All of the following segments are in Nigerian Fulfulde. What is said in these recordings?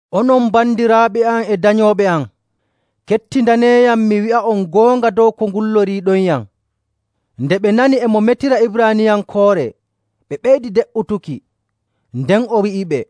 “Onon bandiraaɓe am e danyooɓe am, kettindaneeyam mi wi'a'on goonga dow ko ngulloriiɗonyam.” Nde ɓe nani e mo metiranaɓe Ibraaniyankoore ɓe ɓeydi de''utuki. Nden o wi'iɓe,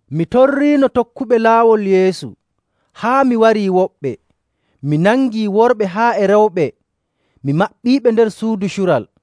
Mi torriino tokkuɓe Laawol Yeesu haa mi warii woɓɓe. Mi nangii worɓe haa e rewɓe, mi maɓɓiiɓe nder suudu cural.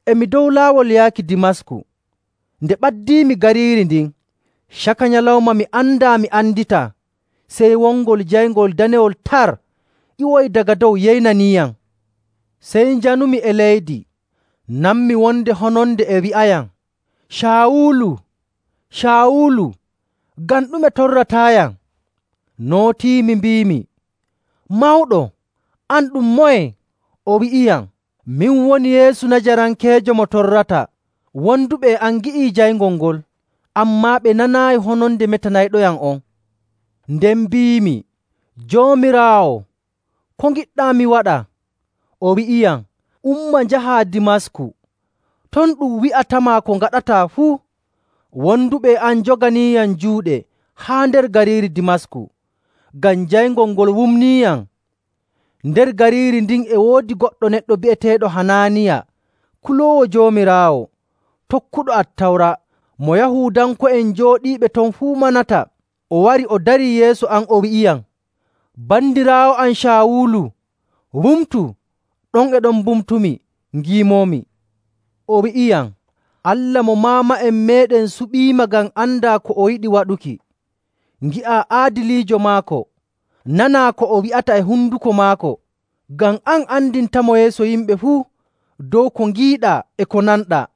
“E mi dow laawol yaaki Dimasku, nde ɓadiimi gariiri ndin, caka nyalawma mi andaa mi anditaa sey wongol jayngol danewol tar ƴiwoyi daga dow yeynaniiyam. Sey njanumi e leydi, nanmi wonde hononde e wi'ayam, ‘Caawulu, Caawulu, ngam ɗume torrataayam?’ Nootiimi mbiimi, ‘Mawɗo, an ɗum moye?’ O wi'iyam, ‘Min woni Yeesu Najarankeejo mo torrataa.’ Wonduɓe e am ngi'i jayngol ngol, ammaa ɓe nanaayi hononde metanayɗoyam on. Nden mbiimi, ‘Joomiraawo, ko ngiɗɗaa mi waɗa?’ O wi'iyam, ‘Umma njahaa Dimasku. Ton ɗum wi'atama ko ngaɗataa fuu.’ Wonduɓe e am njoganiiyam juuɗe haa nder gariiri Dimasku, ngam jayngol ngol wumniiyam. “Nder gariiri ndin e woodi goɗɗo neɗɗo bi'eteeɗo Hanaaniya, kuloowo Joomiraawo, tokkuɗo Attawra, mo Yahuudanko'en jooɗiiɓe ton fuu manata. O wari o darii yeeso am, o wi'iyam, ‘Bandiraawo am Caawulu, wumtu!’ Ɗon e ɗon mbumtumi ngiimoomi. O wi'iyam, ‘Allah mo maama'en meeɗen suɓiima ngam andaa ko o yiɗi waɗuki, ngi'aa Aadiliijo maako, nanaa ko o wi'ata e honduko maako, ngam an andintamo yeeso yimɓe fuu dow ko ngiiɗaa e ko nanɗaa.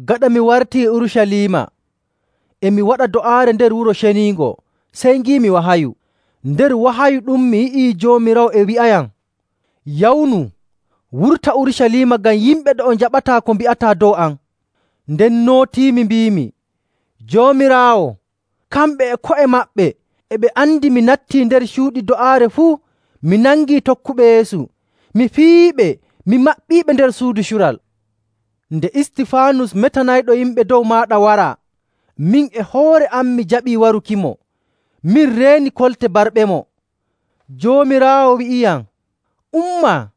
“Gaɗa mi wartii Urucaliima, e mi waɗa do'aare nder Wuro Ceniingo, sey ngiimi wahayu. Nder wahayu ɗum, mi yi'i Joomiraawo e wi'ayam, ‘Yawnu, wurta Urucaliima, ngam yimɓe ɗo'o njaɓataa ko mbi'ataa dow am.’ Nden nootiimi mbiimi, ‘Joomiraawo, kamɓe e ko'e maɓɓe e ɓe andi mi nattii nder cuuɗi do'aare fuu, mi nangii tokkuɓe Yeesu, mi piyiiɓe, mi maɓɓiiɓe nder suudu cural. Nde Istifaanus metanayɗo yimɓe dow maaɗa waraa, min e hoore am mi jaɓii warukimo, min reeni kolte barɓemo.’. Joomiraawo wi'iyam, ‘Umma,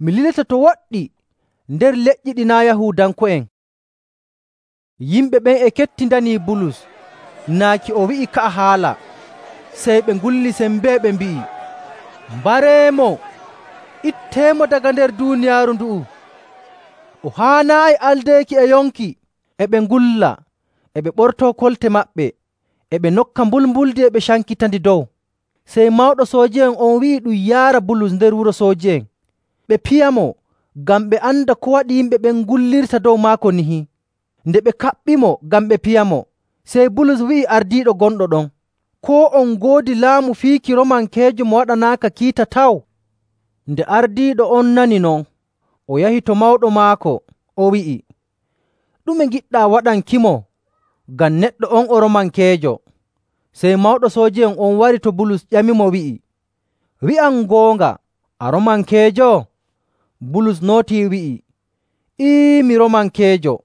mi lilete to woɗɗi nder leƴƴi ɗi naa' Yahuudanko'en.’” Yimɓe ɓen e kettindanii Bulus naaki o wi'i ka'a haala. Sey ɓe ngulli sembee, ɓe mbi'i, “Mbareemo, itteemo daga nder duuniyaaru ndu'u! O haanaayi aldeeki e yonki!” E ɓe ngulla, e ɓe ɓortoo kolte maɓɓe, e ɓe nokka mbulmbuldi e ɓe cankitandi dow. Sey mawɗo sooji'en on wi'i ɗum yaara Bulus nder wuro sooji'en, ɓe piyamo ngam ɓe anda ko waɗi yimɓe ɓen ngullirta dow maako nihi. Nde ɓe kaɓɓimo ngam ɓe piyamo, sey Bulus wi'i ardiiɗo gonɗo ɗon, “Koo on ngoodi laamu fiiki Roomankeejo mo waɗanaaka kiita taw?” Nde ardiiɗo on nani non, o yahi to mawɗo maako, o wi'i, “Ɗume ngiɗɗaa waɗankimo? Ngam neɗɗo on o Roomankeejo!” Sey mawɗo sooji'en on wari to Bulus, ƴamimo wi'i, “Wi'am goonga, a Roomankeejo?” Bulus nootii, wi'i, “Ee, mi Roomankeejo!”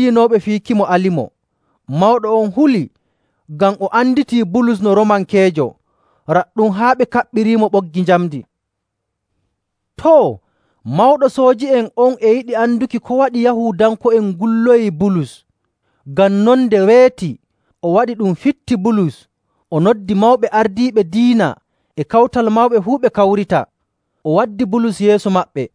Ɗon e ɗon ciryinooɓe fiikimo alimo. Mawɗo on huli, ngam o anditii Bulus no Roomankeejo, raɗɗum haa ɓe kaɓɓiriimo ɓoggi njamndi. Too, mawɗo sooji'en on e yiɗi anduki ko waɗi Yahuudanko'en ngulloyii Bulus. Ngam non, nde weeti o waɗi ɗum fitti Bulus o noddi mawɓe ardiiɓe diina e Kawtal Mawɓe fuu ɓe kawrita. O waddi Bulus yeeso maɓɓe.